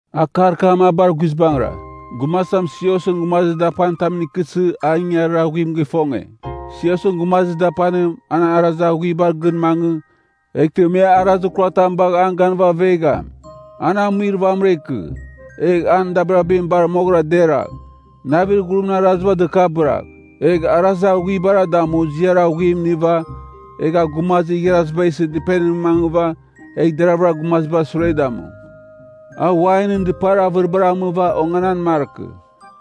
Akar kam a bar guizbangɨra, gumazitam siosɨn gumazir dapanitamɨn ikɨsɨ a ingangarir aghuim gifonge. Siosɨn gumazir dapanim, an arazir aghuibar gɨn mangɨ, eghtɨ me arazir kuratam bagh an ganɨva avegham. An amuir vamɨra ikɨ. Egh an dabirabim bar moghɨra deragh, navir ghurimɨn araziba dɨkabɨragh, egh arazir aghuibara damu ziar aghuim iniva, egh a gumazir igharaziba isɨ dɨpenimɨn mangɨva, egh deravɨra gumazibar sure damu. A wainɨn dɨpar avɨribar amɨva onganan markɨ.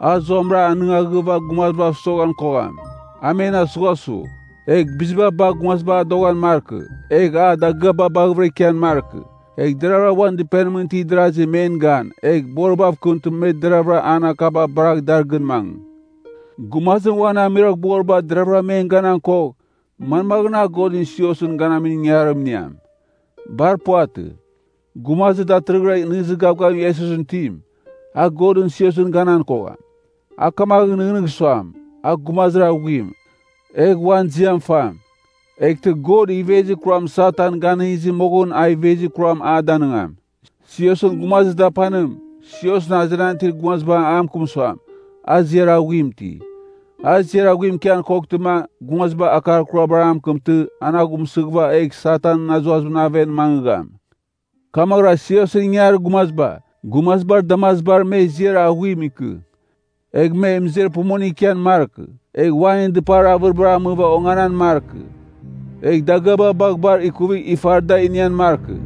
A zuamɨra anɨngaghɨva gumazibav soghan kogham, a men asughasugh. Egh biziba bagh gumaziba adoghan markɨ, egh a dagɨaba baghɨvɨra ikian markɨ. Egh deravɨra uan dɨpenimɨn itir darasi men gan, egh boribav kɨmtɨma me deravɨra an akaba baragh dar gɨn mangɨ. (Gumazim uan amuiroghboriba deraghvɨra men ganan kogh, manmaghɨn a Godɨn siosɨn ganamin ingangarim iniam? Bar puvatɨ.) Gumazir datɨrɨghɨra nɨghnɨzir gavgavim Iesusɨn itim, a Godɨn siosɨn ganan kogham. A kamaghɨn nɨghnɨgh suam, a gumazir aghuim, egh uan ziam fam. Eghtɨ God ivezir kuram Satan ganɨngizɨ moghɨn a ivezir kuram a danɨngam. Siosɨn gumazir dapanim, siosɨn azenan itir gumaziba a mɨkɨm suam, a ziar aghuim iti. A ziar aghuim ikian koghtɨma, gumaziba akar kurabar a mɨkɨmtɨ, an aghumsɨghɨva, egh Satanɨn azuazimɨn aven mangɨgham. Kamaghɨra siosɨn ingangarir gumaziba, gumazibar damazibar me ziar aghuim ikɨ. Egh me mɨzer pumuningɨn ikian markɨ, egh wainɨn dɨpar avɨribar amɨva onganan markɨ. Egh dagɨaba bagh bar ikuvigh ifar da inian markɨ.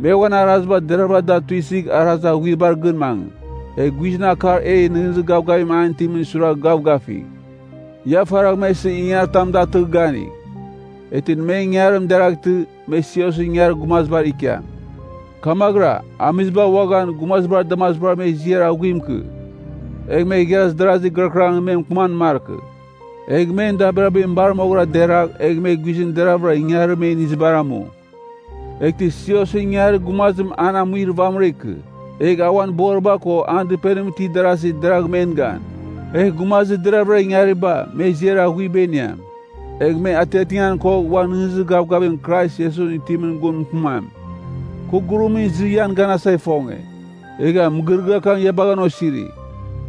Me uan araziba deraghvɨra da tuisɨgh arazir aghuibar gɨn mangɨ, egh guizɨn akar e nɨghnɨzir gavgavim an itimɨn suiragh gavgafigh. Ia faragh me isɨ ingangaritam datɨgh, ganigh. Eghtɨ men ingangarim deraghtɨ, me siosɨn ingangarir gumazibar ikiam. Kamaghɨra, amiziba uaghan, gumazibar damazibar me ziar aghuim ikɨ. Egh me igharaz darazi gɨrakɨrangɨn me mɨkɨman markɨ. Egh men dabirabim bar moghɨra deragh, egh me guizɨn deraghvɨra ingangarir me inizibar amu. Eghtɨ siosɨn ingangarir gumazim an amuir vamɨra ikɨ. Egh a uan boriba ko an dɨpenimɨn itir darazi deragh men gan. Egh gumazir deravɨra ingariba, me ziar aghuiba iniam. Egh me atiatingan kogh uan nɨghnɨzir gavgavir Krais Iesusɨn itimɨn gun mɨkɨmam. Kɨ gurumra izɨ ian ganasa ifonge, egha mɨgɨrɨgɨar kam ia bagha an osiri.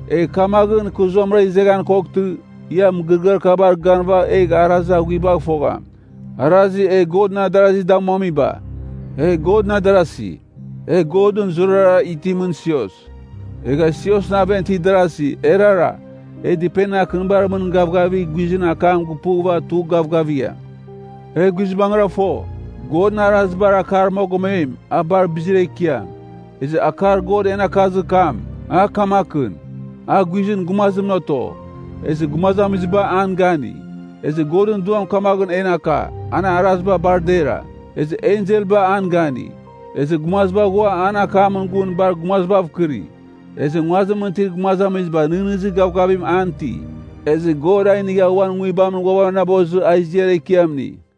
Egh kamaghɨn, kɨ zuamɨra izeghan koghtɨ, ia mɨgɨrɨgɨar kabar ganɨva egh ia arazir aghuibagh fogham, arazir e Godɨn adarazi damuamiba. E Godɨn adarasi, e Godɨn zurara itimɨn sios. Egha siosɨn aven itir darasi, erara, e dɨpenir akɨnibar mɨn gavgavigh guizɨn akam gupughɨva tugh gavgavigham. E guizbangɨra fo, Godɨn arazibar akar mogomem, a bar bizir ekiam. Ezɨ akar God en akazir kam, a kamakɨn, A guizɨn gumazimɨn oto, ezɨ gumazamiziba an gani. Ezɨ Godɨn Duam kamaghɨn en aka, an araziba bar dera, Ezɨ enselba an gani. Ezɨ gumaziba ghua an akamɨn gun bar gumazibav kɨri. Ezɨ nguazimɨn itir gumazamiziba nɨghnɨzir gavgavim an iti. Ezɨ God a inigha uan Nguibamɨn ghuavanabozɨ a ziar ekiam ini.